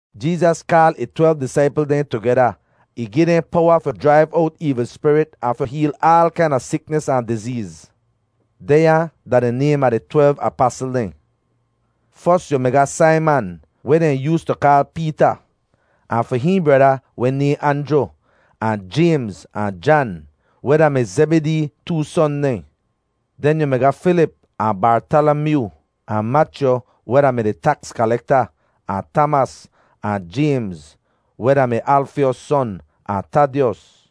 Jeezas kaal ih twelv disaipl dehn tugeda. Ih gi dehn powa fi jraiv owt eevl spirit ahn fi heel aal kaina siknis ahn dizeez. Dehnya da di naym a di twelv apasl dehn: fos yu mi ga Saiman, weh dehn yoostu kaal Peeta, ahn fi hihn breda weh nayhn Anjru; ahn Jaymz ahn Jan, weh da-mi Zebidee too son dehn. Den yu mi ga Filip ahn Bartalamyoo; ahn Machyu weh da-mi di taks kalekta, ahn Tamas; ahn Jaymz, weh da-mi Alfyos son; ahn Tadyos.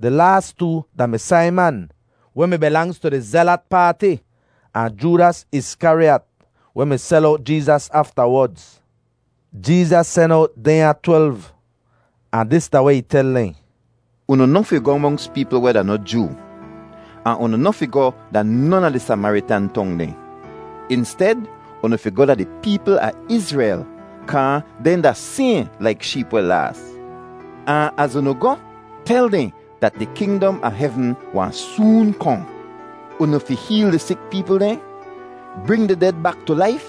Di laas too da-mi Saiman, weh mi bilangz tu di Zelat Paati; ahn Joodas Iskariyat, weh mi sel owt Jeezas aftawodz. Jeezas sen owt dehnya twelv ahn dis da weh ih tel dehn: “Unu noh fi goh monks peepl weh da noh Joo, ahn unu noh fi goh da non a di Samaritan tong dehn. Insted, unu fi goh da di peepl a Izrel kaa dehn da sayhn laik sheep weh laas. Ahn az unu goh, tel dehn dat di kingdom a hevn wahn soon kohn. “Unu fi heel di sik peepl dehn, bring di ded bak tu laif,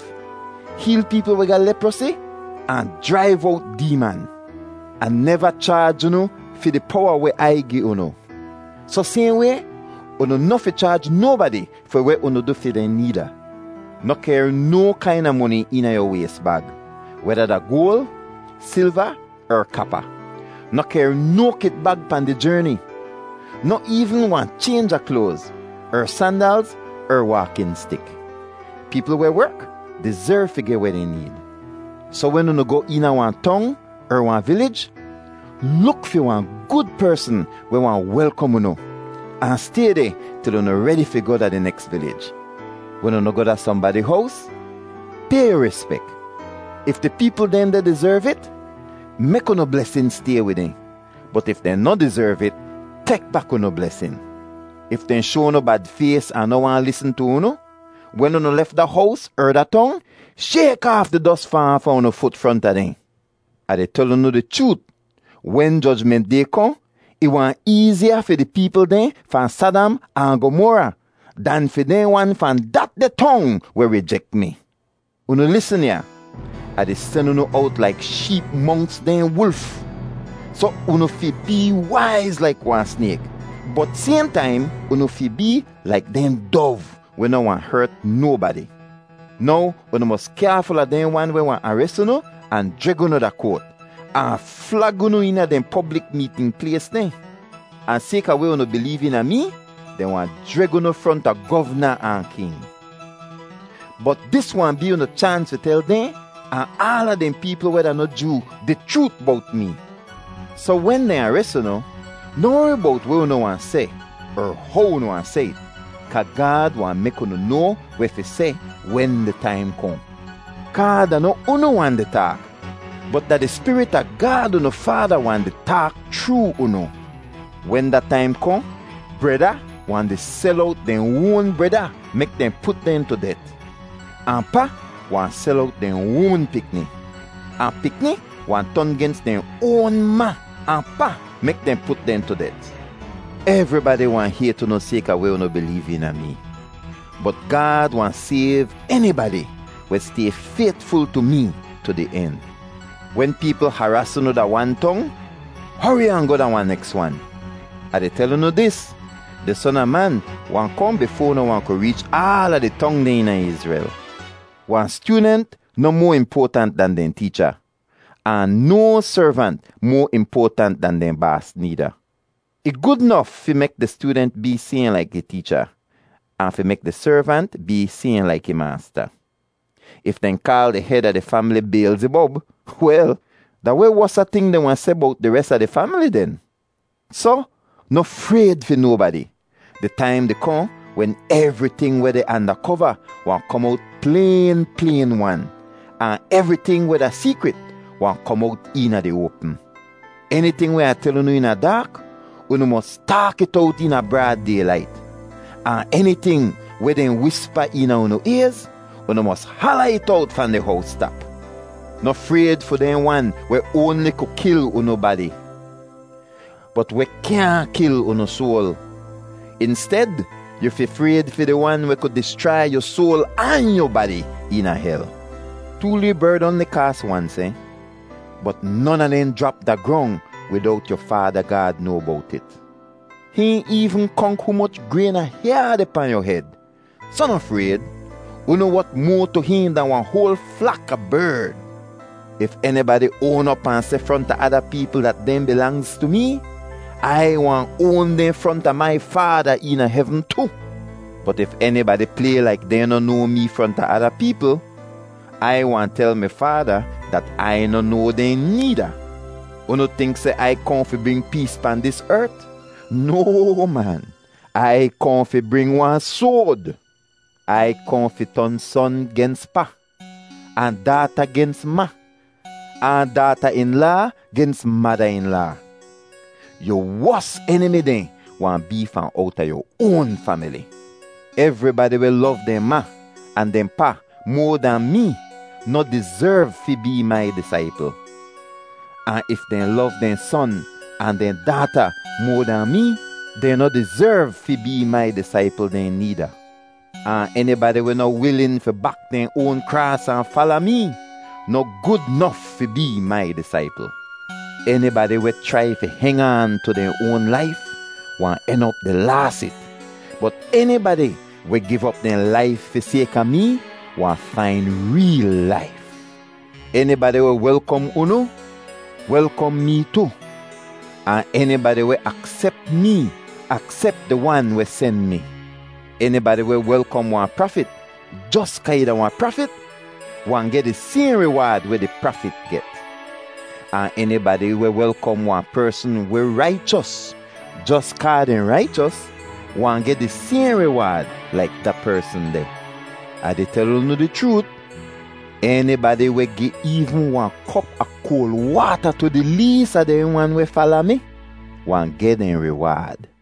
heel peepl weh ga leprosi, ahn jraiv owt deeman. Ah neva chaaj unu fi di powa weh Ai gi unu. Soh sayhn way, unu noh fi chaaj nobadi fi weh unu du fi dehn needa. Noh kehr no kaina moni eena yu ways bag, weda da goal, silva er kapa; noh kehr no kitbag pahn di jerni, noh eevn wahn chaynj a kloaz er sandalz er waakin stik. Peepl weh werk dizerv fi geh weh dehn need. “Soh wen unu goh eena wahn tong er wahn vilij, luk fi wahn gud persn weh wahn welkom unu, ahn stay deh til unu redi fi goh da di neks vilij. Wen unu goh da sohnbadi hows, pay yu rispek. If di peepl dehn deh dizerv it, mek unu blesin stay wid dehn. Bot if dehn noh dizerv it, tek bak unu blesin. If dehn shoa unu bad fays ahn noh waahn lisn tu unu, wen unu lef da hows er da tong, shayk aaf di dos fahn aafa unu fut fronta dehn. Ah di tel unu di chroot, wen Jojment Day kohn, ih wahn eeziya fi di peepl dehn fahn Sadam ahn Gomora dan fi dehn wan fahn datdeh tong weh rijek mi. “Unu lisn ya. Ah di sen unu owt laik sheep monks dehn wulf. Soh unu fi bee waiz laik wahn snayk, bot sayhn taim, unu fi bee laik dehn dov weh noh wahn hert nobadi. Now unu mos kyaaful a dehn wan weh wahn ares unu ahn jreg unu da koat ahn flag unu eena dehn poblik meetn plays dehn. Ahn sayka weh unu bileev eena mee, dehn wahn jreg unu fronta govna ahn king; bot dis wahn bee unu chaans fi tel dehn ahn aala dehn peepl weh da noh Joo di chroot bowt mee. Soh wen dehn ares unu, noh wori bowt weh unu wahn seh er how unu wahn seh it kaa Gaad wahn mek unu noa weh fi seh wen di taim kohn. Kaa da noh unu wahn di taak, bot da di Spirit a Gaad unu Faada wahn di taak chroo unu. “Wen da taim kohn, breda wahn di sel owt dehn oan breda mek dehn put dehn tu det, ahn pa wahn sel owt dehn oan pikni. Ahn pikni wahn ton gens dehn oan ma ahn pa mek dehn put dehn tu det. Evribadi wahn hayt unu sayka weh unu bileev eena mee. Bot Gaad wahn sayv enibadi weh stay faytful tu mee tu di en. Wen peepl haraas unu da wan tong, hori ahn goh da wahn neks wan. Ah di tel unu dis: Di Son a Man wahn kohn bifoa unu wahn ku reech aala di tong dehn eena Izrel. “Wahn styoodent noh moa impoatant dan dehn teecha, ahn no servant moa impoatant dan dehn baas needa. Ih gud nof fi mek di styoodent bee sayhn laik ih teecha, ahn fi mek di servant bee sayhn laik ih maasta. If dehn kaal di hed a di famili Biyelzibob, wel, da weh wosa ting dehn wahn seh bowt di res a di famili den? “Soh noh frayd fi nobadi! Di taim di kohn wen evriting weh deh anda kova wahn kom owt playn playn-wan, ahn evriting weh da seekrit wahn kom owt eena di oapm. Eniting weh Ah tel unu eena daak, unu mos taak it owt eena braad daylait, ahn eniting weh dehn wispa eena unu ayz, unu mos hala it owt fahn di howstap. Noh frayd fi dehn wan weh oanli ku kil unu badi, bot weh kyaahn kil unu soal. Insted, yu fi frayd fi di Wan weh ku dischrai yu soal ahn yu badi eena hel. Too lee berd oanli kaas wan sehn, bot non a dehn jrap da grong widowt yu Faada Gaad noa bowt it. Hihn eevn konk humoch grayn a hyaa deh pahn yu hed. Soh noh frayd, unu wot moa tu hihn dahn wahn hoal flak a berd. “If enibadi oan op ahn seh fronta ada peepl dat dehn bilangz tu mee, Ai wahn oan dehn fronta mai Faada eena hevn tu. Bot if enibadi play laik dehn noh noa mee fronta ada peepl, Ai wahn tel mi Faada dat Ai noh noa dehn needa. “Unu tink seh Ai kohn fi bring pees pahn dis ert? No, man. Ai kohn fi bring wahn soad. Ai kohn fi ton ‘son gens pa, ahn daata gens ma, ahn daata-in-laa gens mada-in-laa. Yu wos enimi dehn wahn bee fahn owta yu oan famili.’ “Evribadi weh lov dehn ma ahn dehn pa moa dahn mee noh dizerv fi bee mai disaipl. Ahn if dehn lov dehn son ahn dehn daata moa dahn mee, dehn noh dizerv fi bee mai disaipl dehn needa. Ahn enibadi weh noh wilin fi bak dehn oan kraas ahn fala mee noh gud nof fi bee mai disaipl. Enibadi weh chrai fi heng aan tu dehn oan laif wahn en op di laas it, bot enibadi weh giv op dehn laif fi sayka mee wahn fain reel laif. “Enibadi weh welkom unu welkom mee tu. Ahn enibadi weh aksep mee aksep di Wan weh sen mi. Enibadi weh welkom wahn prafit jos kaa ih da wahn prafit wahn geh di sayhn riwaad weh di prafit get. Ahn enibadi weh welkom wahn persn weh raichos jos kaa dehn raichos wahn geh di sayhn riwaad laik da persn deh. Ah di tel unu di chroot, enibadi weh gi eevn wahn kop a koal waata tu di lees a dehn wan weh fala mi wahn geh dehn riwaad.”